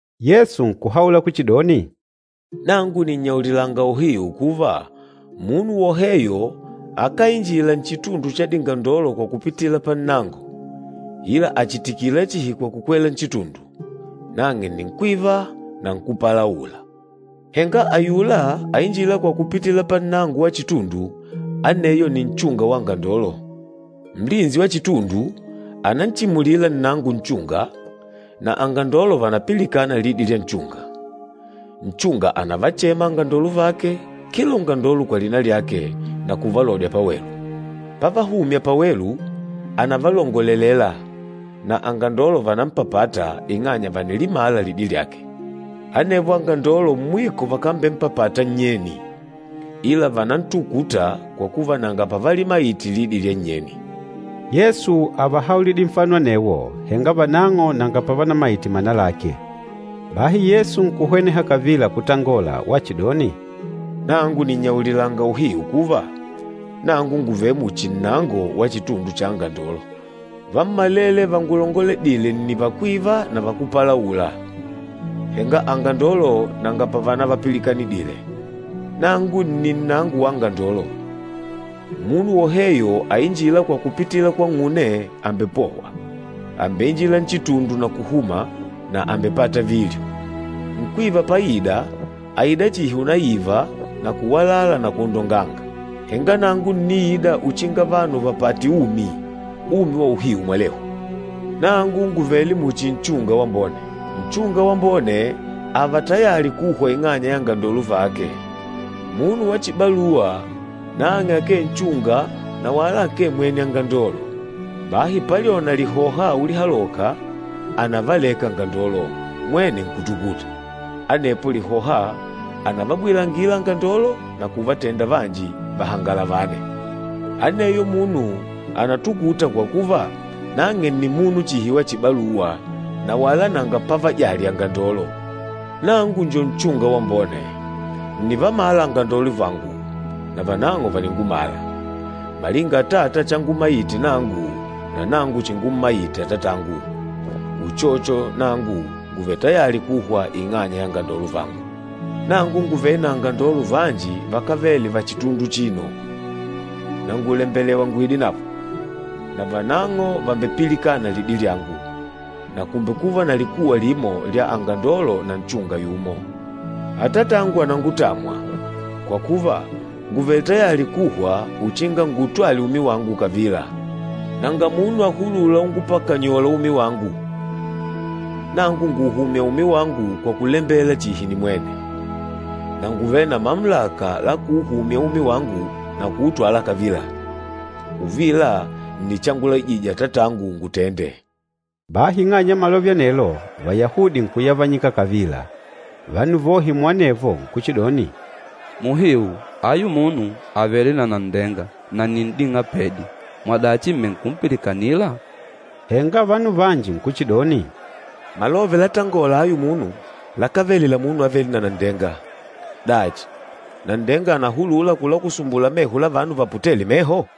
Yesu nkuhaula kuchidoni, “Nangu nìnnyaulilanga uhiu kuva, munu woheyo akáinjila nchitundu cha dingandolo kwa kupitila pannango, ila àchitikila chihi kwa kukwela nchitundu, nang'e nni nkwîva na nkúpalaula. Henga ayula ainjîla kwa kupitila pannango wa chitundu, aneyo nni nchunga wa angandolo. Nlinsi wa chitundu ànanchimulila nnango nchunga, na angandolo vànapilikana lidi lya nchunga. Nchunga ànavachema angandolo vake kila ungandolo kwa lina lyake, na kuvalodya pawelu. Pávahùmyà pawelu, ànavalongolelela, na angandolo vànampapata ing'anya vànilimala lidi lyake. Anevo angandolo mwiko vakambempapata nnyeni, ila vànantukuta kwa kuva nanga pavalimaite lidi lya nnyeni.” Yesu ávahaulidile nfano anewo, henga vanang'o nanga pavanamaite mana lake. Bahi Yesu nkuhweneha kavila kutangola wachidoni, “Nangu nìnnyaulilanga uhiu kuva, nangu ngùvele muchi nnango wa chitundu cha angandolo. Vammalele vangulongoledîle nni vakwîva na vakúpalaula, henga angandolo nanga pavanavapilikanidile. Nangu nni nnango wa angandolo. Munu woheyo ainjîla kwa kupitila kwang'une, àmbepohwa. Àmbeinjila nchitundu na kuhuma, na àmbepata vilyo. Nkwîva páìdà, àida chihi unaiva na kuwalala na kwondonganga. Henga nangu ǹniida uchinga vanu vàpate umi, umi wa uhiu mwalehu. Nangu ngùvele muchi nchunga wambone. Nchunga wambone ààva tayali kuhwa ing'anya ya angandolo vake. Munu wa chibaluwa, nang'e akee nchunga na wala akee mwene angandolo. Bahi palyona lihoha ulihaloka, ànavaleka angandolo, mwene nkutukuta. Anepo lihoha ànavabwilangila angandolo na kuvatenda vanji vahangalavane. Aneyo munu ànatukuta kwa kuva, nang'e nni munu chihi wa chibaluwa na wala nanga pavajali angandolo. Nangu njo nchunga wambone. Ǹnivamala angandolo vangu, na vanang'o vàningumala, malinga Atata changummaite nangu, na nangu chingummaite Atatangu. Uchocho nangu ngùvele tayali kuhwa ing'anya ya angandolo vangu. Nangu ngùvele na angandolo vanji vakávele va chitundu achino, na ngùlembelewa nguidenavo, na vanang'o vàmbepilikana lidi lyangu, na kùmbekuva na likuwa limo lya angandolo na nchunga yumo. Atatangu ànangutamwa, kwa kuva ngùvele tayali kuhwa uchinga nguutwale umi wangu kavila. Nanga munu àhulula ungupakanyola umi wangu, nangu ngùuhumya umi wangu kwa kulembela chihi nimwene. Na ngùvele na mamulaka la kuuhumya umi wangu na kuutwala kavila. Uvila nni changulaijije Atatangu ngutende.” Bahi ing'anya ya malove anelo, Vayahudi nkuyavanyika kavila. Vanu vohe muanevo nkuchidoni, “Muhiu ayu munu àvele na nanndenga na nni n'ding'apedi! Mwadachi m̀menkupilikanila?” Henga vanu vanji nkuchidoni, “Malove latángôla ayu munu lakávele la munu avêle na nanndenga. Dachi, nanndenga ànahulula kulakusumbula meho la vanu vaputêle meho?”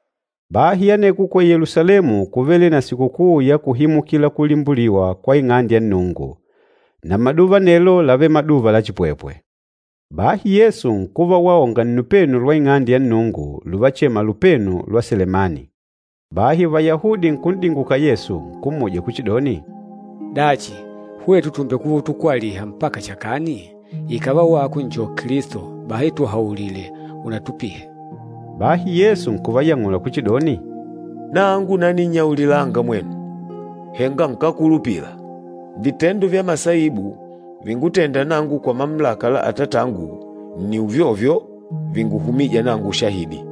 Bahi aneko ku Yelusalemu kúvele na Sikukuu ya Kuhimukila Kulimbuliwa kwa Ing'ande ya Nnungu. Na maduva anelo lávele maduva la chipwepwe. Bahi Yesu nkuva waonga nnupenu lwa Ing'ande ya Nnungu, luvachema Lupenu lwa Selemani. Bahi Vayahudi nkun'dinguka Yesu, nkummuja kuchidoni, “Dachi, hwetu tùmbekuva utukwaliha mpaka chakani? Ikàva wako njo Kilisto, bahi tuhaulile unatupihe.” Bahi Yesu nkuvayang'ula kuchidoni, “Nangu naninnyaulilanga mwenu, henga nkákulupila. Vitendo vya masaibu vingútênda nangu kwa mamulaka la Atatangu nni uvyovyo vinguhumîja nangu ushahidi.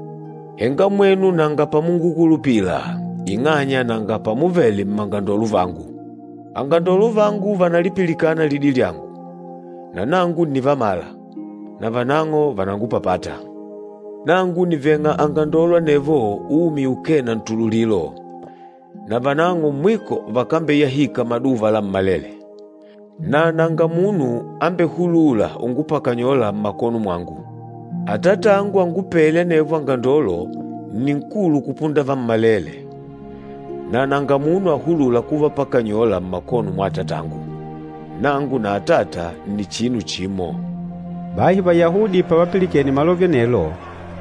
Henga mwenu nanga pamungukulupila ing'anya nanga pamuvele mmangandolo vangu. Angandolo vangu vànalipilikana lidi lyangu, na nangu ǹnivamala, na vanang'o vànangupapata. Nangu nìveng'a angandolo anevo umi ukee na ntululilo, na vanang'o mwiko vakambeyahika maduva lammalele, na nanga munu ambehulûla ungupakanyola mmakono mwangu. Atatangu angupêle anevo angandolo nni nkulu kupunda vammalele, na nanga munu ahulûla kuvapakanyola mmakono mwa Atatangu. Nangu na Atata nni chinu chimo.” Bahi Vayahudi pavapilikene malove anelo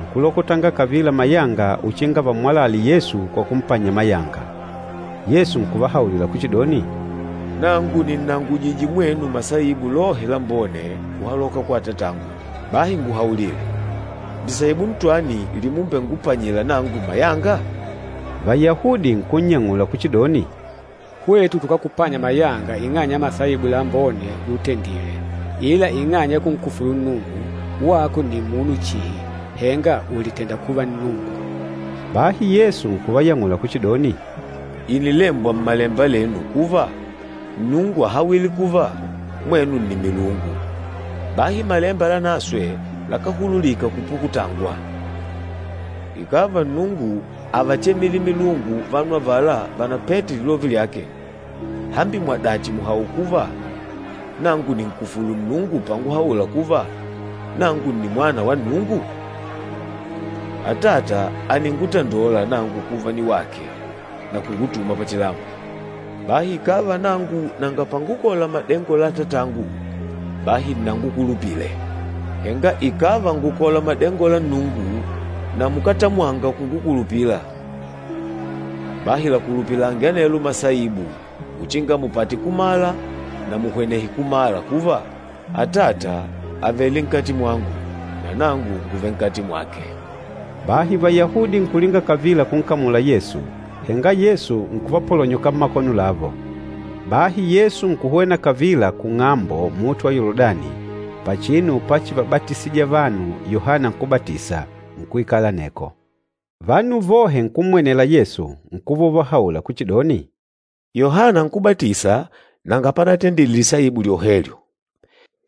nkulokotanga kavila mayanga uchinga vammwalale Yesu kwa kumpanya mayanga. Yesu nkuvahaulila kuchidoni, “Nangu nìnnangujije mwenu masaibu lohe lambone kuhaloka kwa Atatangu. Bahi nguhaulile, lisaibu ntwani limumbengupanyila nangu mayanga?” Vayahudi nkunnyang'ula kuchidoni, “Hwetu tukákupanya mayanga ing'anya ya masaibu lambone lutendile, ila ing'anya ya kunkufulu Nnungu! Wako nni munu chihi, henga ùlitenda kuva Nnungu.” Bahi Yesu nkuvayang'ula kuchidoni, “Ìnilembwa Mmalemba lenu kuva, Nnungu áhawile kuva, ‘Mwenu ni milungu.’ Bahi Malemba Lanaswe lakáhululika kupukutangwa. Ikàva Nnungu ávachemile milungu vanu avala vánapete lilove lyake, hambi mwadachi mùhaula kuva nangu nìnkufulu Nnungu panguhaula kuva nangu nni Mwana wa Nnungu? Atata àningutandola nangu kuva niwake na kungutuma pachilambo. Bahi ikàva nangu nanga pangukola madengo la Atatangu, bahi nnangukulupile. Henga ikàva ngùkola madengo la Nnungu, na mukátamwanga kungukulupila, bahi lakulupilange anelo masaibu uchinga mupate kumala na muhwenehe kumala kuva, Atata àvele nkati mwangu na nangu ngùvele nkati mwake.” Bahi Vayahudi nkulinga kavila kunkamula Yesu, henga Yesu nkuvapolonyoka mmakono lavo. Bahi Yesu nkuhwena kavila kung'ambo luhunde lwa Yoludani, pachinu pachivabatisija vanu Yohana Nkúbatisa, nkuikala aneko. Vanu vohe nkummwenela Yesu, nkuva uvahaula kuchidoni, “Yohana Nkúbatisa nanga panatendile lisaibu lyohelyo,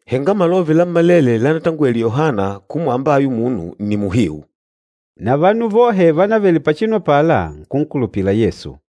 henga malove lammalele lánatangwele Yohana kumwamba ayu munu nni muhiu.” Na vanu vohe vánavele pachinu apala, nkunkulupila Yesu.